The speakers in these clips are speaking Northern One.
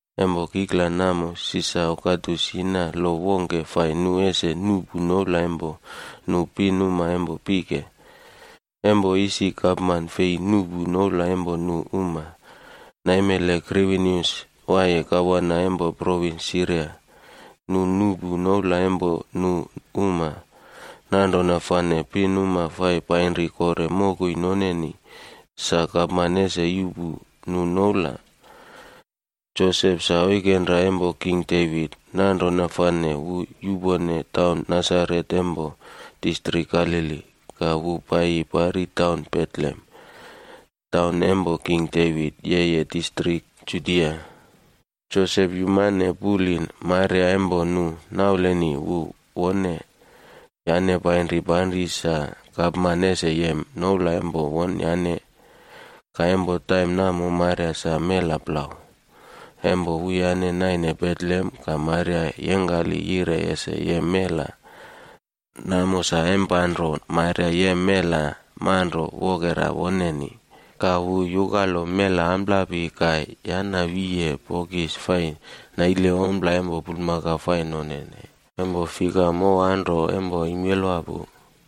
Empo kikla namo Sisar Ogastus yina lo wongke fai nu ese nuꞌpu noula empo nu pinuma empo pike. Empo isi gapman fei nuꞌpu noula empo nu pinuma, naimele Kwirinius waiye gavana empo provins Siria,a nu nuꞌpu noula empo nu uma. Nanrona fane nu pinuma fai painri kore mokoi noneni, sa gapman ese yuꞌpu nu noula. Josep sa oikenra empo King Devit. Nanrona fane wu yupone taun Nasaret empo distrik Galili, ka wu paiyi pari taun Betlehem, taun empo king Devit, yeye distrik Judia. Josep yumane puli Maria empo nu nauleni wu wone, yane painri panri sa gapman ese yem noula empo wonyane. Ka empo taim namo Maria sa mela plau. Empo wuyane naine Betlehem, ka Maria yengkali yire ese yem mela. Namo sa empanro Maria yem mela manro wokera woneni. Ka wu yukalo mela amplapi ka yana wiye bokis fai naile ompla empo bulmakau fai nonene, empo fika mow anro empo imelwa pinuma pu.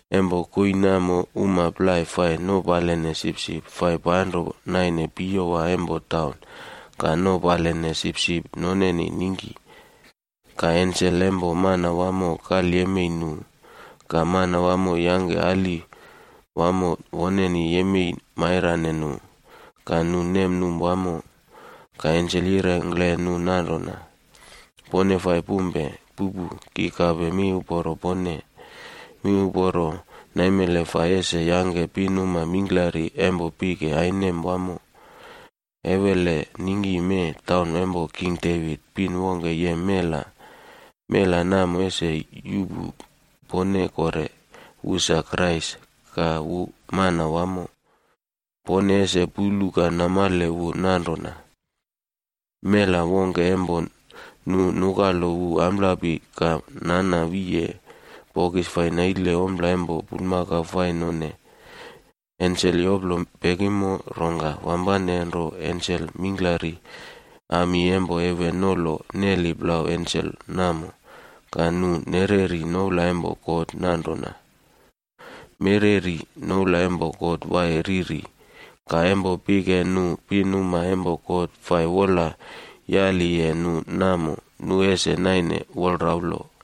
Empo koii namo uma plai fai nopaline sipsipb fai panro naine piyowa empo taun, ka nopaline sipsip noneni ningki. Ka ensel empo Manawamo kalyemei nu, ka Manawamo yangke ali wamo woneni yemei mairane nu, ka nu nemnum wamo. Ka ensel yirengkle nu nanrona, “Pone fai pumpe. Pupu! Ki kape miuporo pone, miuporo naimele fai ese yangke pinuma mingklari empo pike ainem wamo. Ewele ningki mee taun empo king Devit, pin wongke yem mela. Mela namo ese yuꞌpu pone kore. Wu sa Krais,c ka wu Manawamo. Pone ese pulu ka namale wu nanrona. Mela wongke empo nu nukalo wu amplapi ka nana wiye bokis fai naile ompla empo bulmakau fai none.” Ensel yoplo pekimo, rongka wampane nro ensel mingklari ami empo heven nolo neli plau ensel namo. Ka nu nereri noula empo God ka nire nanrona: “Mereri noula empo God Waiye Riri. Ka empo pike nu pinuma empo God fai wola yaliye nu namo, nu ese naine wolraulo.”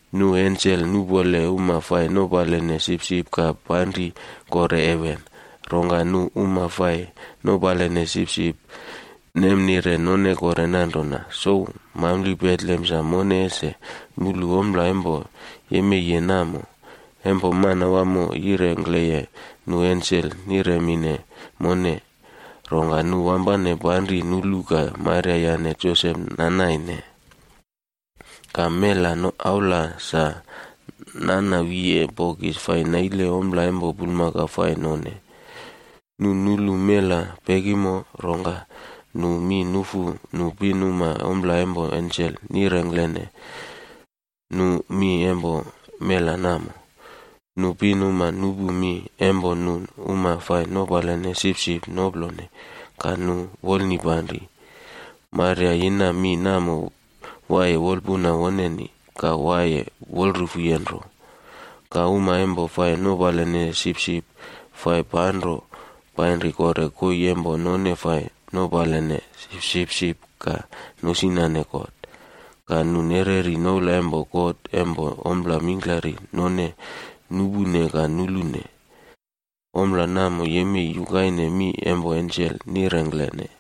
Nu ensel nupole uma fai nopaline sipsip ka panri kore heven. Rongka nu uma fai nopaline sipsip nemnire none kore nanrona, “Souw, mampli taun Betlehem sa mone ese mulu ompla empo yemeiye namo, empo Manawamo yirengkleye nu ensel niremine mone.” Rongka nu wampane panri nulu ka Maria yane Josep nanaine, ka mela aula sa nana wiyeye bokis fai naile ompla empo bulmakau fai none. Nu nulu mela pekimo, rongka nu mi nufu nu pinuma ompla empo ensel nirengklene nu mi empo mela namo. Nu pinuma nupu mi empo nu uma fai nopaline sipsip noplone, ka nu wolnipanri. Maria yina mi namo waiye wolpuna woneni, ka waiye wolrufuye nro. Ka uma empo fai nopaline sipsip fai panro painri kore koii empo none fai nopaline sipsip ka nosinane God. Ka nu nereri noula empo God empo ompla mingklari none nupune ka nulune. Ompla namo yemei yukaine mi isi ensel yirengkleye.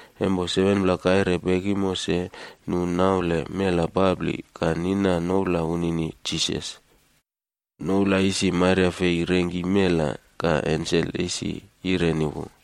Empo 7pla kaire pekimo se, nu naule mela papli, ka nina noula wunini Jisas. Noula isi Maria fei rengki mela, ka ensel isi yireni wu.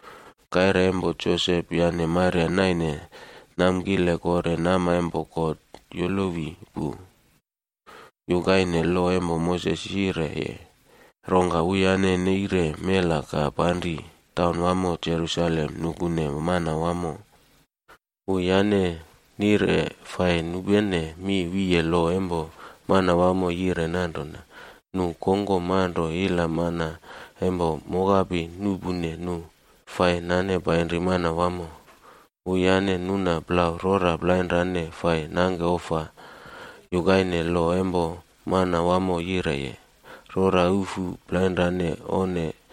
Kaire empo Josep yane Maria naine namkile kore nama empo Godd yolowi pu, yukaine lo empo Moses yireye, rongka wuyane neire mela ka panri taunwamo Jerusaleme nane wu paiyi Manawamo. Wuyane nire fai nupene mi wiye lo empo Manawamo yire nanrona, “Nu kongkom manro ila mana empo mokapi nuꞌpune, nu fai nane paiyi Manawamo.” Wuyane nuna plau rora plainrane fai nangke ofa, yukaine lo empo Manawamo yireye, “Rora ufu plainrane onne,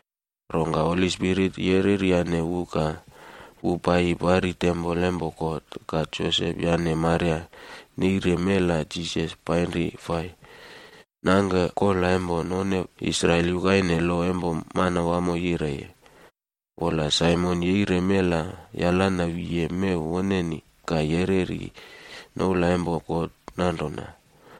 Rongka Holi Spirit yereryane wu ka wu paiyi pari tempol empo God. Ka Josep yane Maria neire mela Jisas painri fai nangke kola empo none Israel yukaine lo empo Manawamo yireye. Wola Simion yeire mela ka yalana wiye mew woneni. Ka yereri noula empo God nanrona: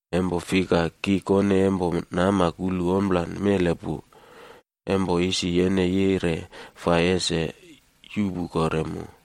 Empo fika, ki kone empo nama kulu ompla namo pu, empo isi yene yire ese yuꞌpu mu kore.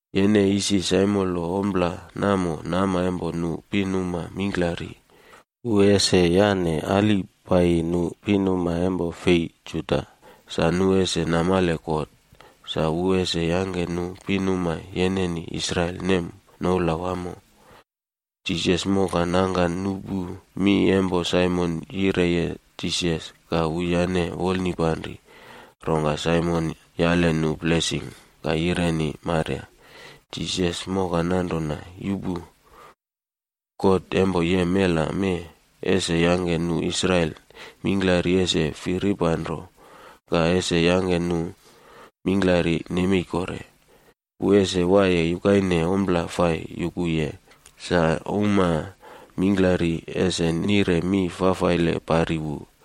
Yene isi saimolo ompla namo nama empo nu pinuma mingklari. Wu ese yane ali paiyi nu uma fei Juda, sa nu ese namale God. Ka wu ese yangke nu pinuma yeneni Israel ese nem noula wamo.” Jisas moka nangka nupu mi empo Simion yireye Jisas, ka wuyane wolnipanri. Rongka Simion yane nu blesing, ka yireni Maria, Jisas moka nanrona, “Yupu! God empo yem mela mee, ese yangke nu Israel mingklari ese firipanro, ka ese yangke mingklari nemei kore. Wu ese waiye yukaine mak wongke, sa uma mingklari ese nire mi fafaile pari wu.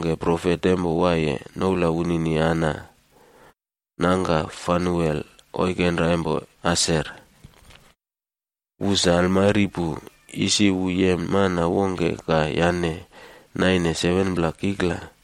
Profet pin wongke, noula wunini Ana. Nangka Fanuel oikenra empo Aser. Wu sa almari pu. Isi wu yem mana wongke ka yane naine 7pla kikla.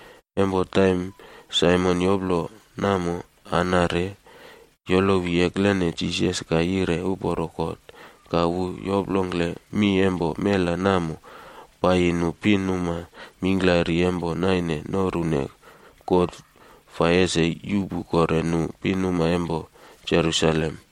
Empo Simion yoploye namo, Ana re yolowi eklene Jisas ka yire uporo God. Ka wu yoplongkle mi empo mela namo paiyi nu pinuma mingklari empo naine norune God ese yuꞌpu kore nu pinuma empo Jerusalem.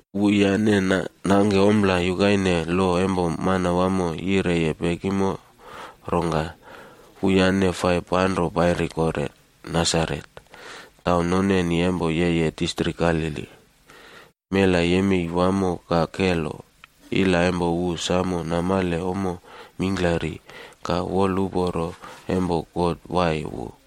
Wuyane nangke ompla yukaine lo empo Manawamo yireye pekimo, rongka wuyane fai panro painri kore Nasaret,g taun noneni empo yeye distrik Galili. Mela yemei wamo ka kelo. Ila empo wu samo namale ommo mingklari. Ka wolpalo empo God waiye wu.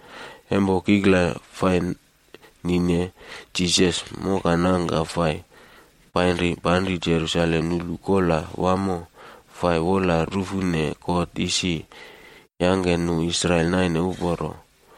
Empo kikla fai nine, Jisas mokanangka fai painri panri Jerusalem nulu Kola Wamo Fai Wola Rufune God Isi Yangke Nu Israel Naine Uporo,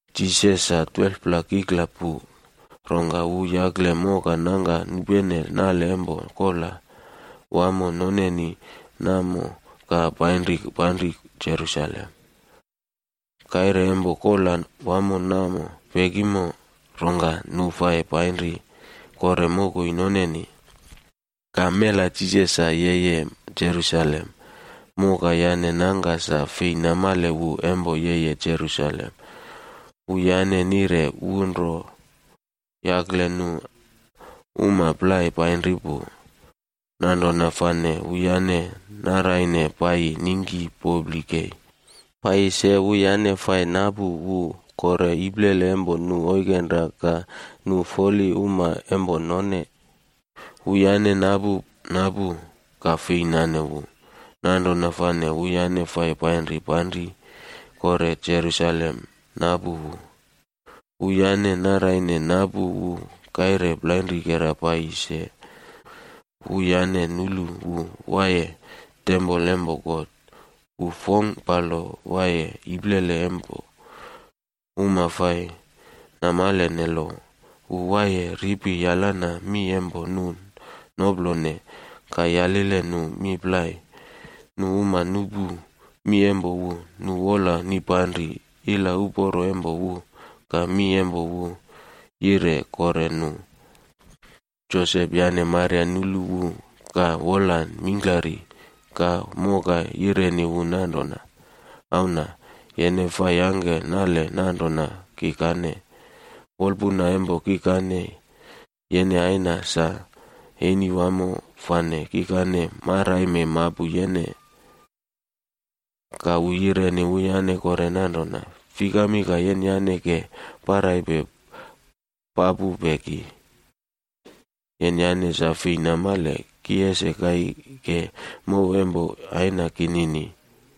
Jisas sa 12pla kikla pu, rongka wu yakle moka nangka nupene nale empo kola wamo fai nonene namo ka painri panri Jerusalem. Kaire empo kola wamo namo pekimo, rongka nu fai painri kore mokoi noneni. Ka mela Jisas sa yeye Jerusalem. Moka yane nangka fei namale wu empo yeye. Wuyane wola nanrona wu ro yakle nu uma plai painri pu. Nanrona fane wuyane naraine paiyi ningki popli kei. Se wuyane fai napu wu kore iplele empo nu oikenra ka nu foluma empo none. Wuyane napu napu, ka fei nane wu. Nanrona fane wuyane fai painri panri kore Jerusalem napu wu. Wuyane naraine napu wu kaire plainrikera paiyi se, wuyane nulu wu waiye tempol empo God. Wu fongkpalo waiye iplele empo uma fai namalene lo. Wu waiye ripi yalanaye mi empo nu noplone, ka yalileye nu mi plai. Nu uma nupu mi empo wu, nu wola nipanri ila uporo empo wu ka mi empo wu yire kore nu. Josep yane Maria nulu wu ka wola mingklari. Ka moka yireni wu nanrona, “Auna, yene fai yangke nale nanrona kikane? Wolpuna empo kikane yene aina sa eni wamo fane kikane maraime mapu yene.” Ka wu yireni wuyane kore nanrona, “Fikami ka yenyane ke paraipe papupe ki? Yenyane sa fei namale, ki ese kaike mow empo Aina kinini?”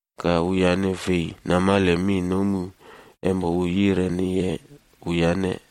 Ka wuyane fei namale mi nomu empo wu yireniye wuyane.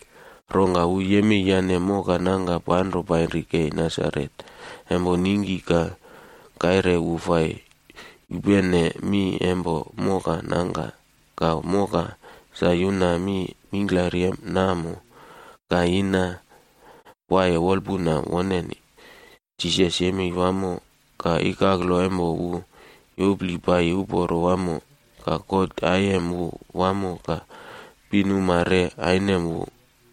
Rongka wu yemei yane moka nangka panro painri kei Nasaret, empo ningki ka kaire wu fai yupene mi empo moka nangka. Ka moka sa yuna mi mingklari namo ka yina waiye wolapuna woneni. Jisas yemei wamo, ka ikaklo empo wu yopli paiyi uporo wamo. Ka God aiyem wu wamo ka pinuma re ainem wu.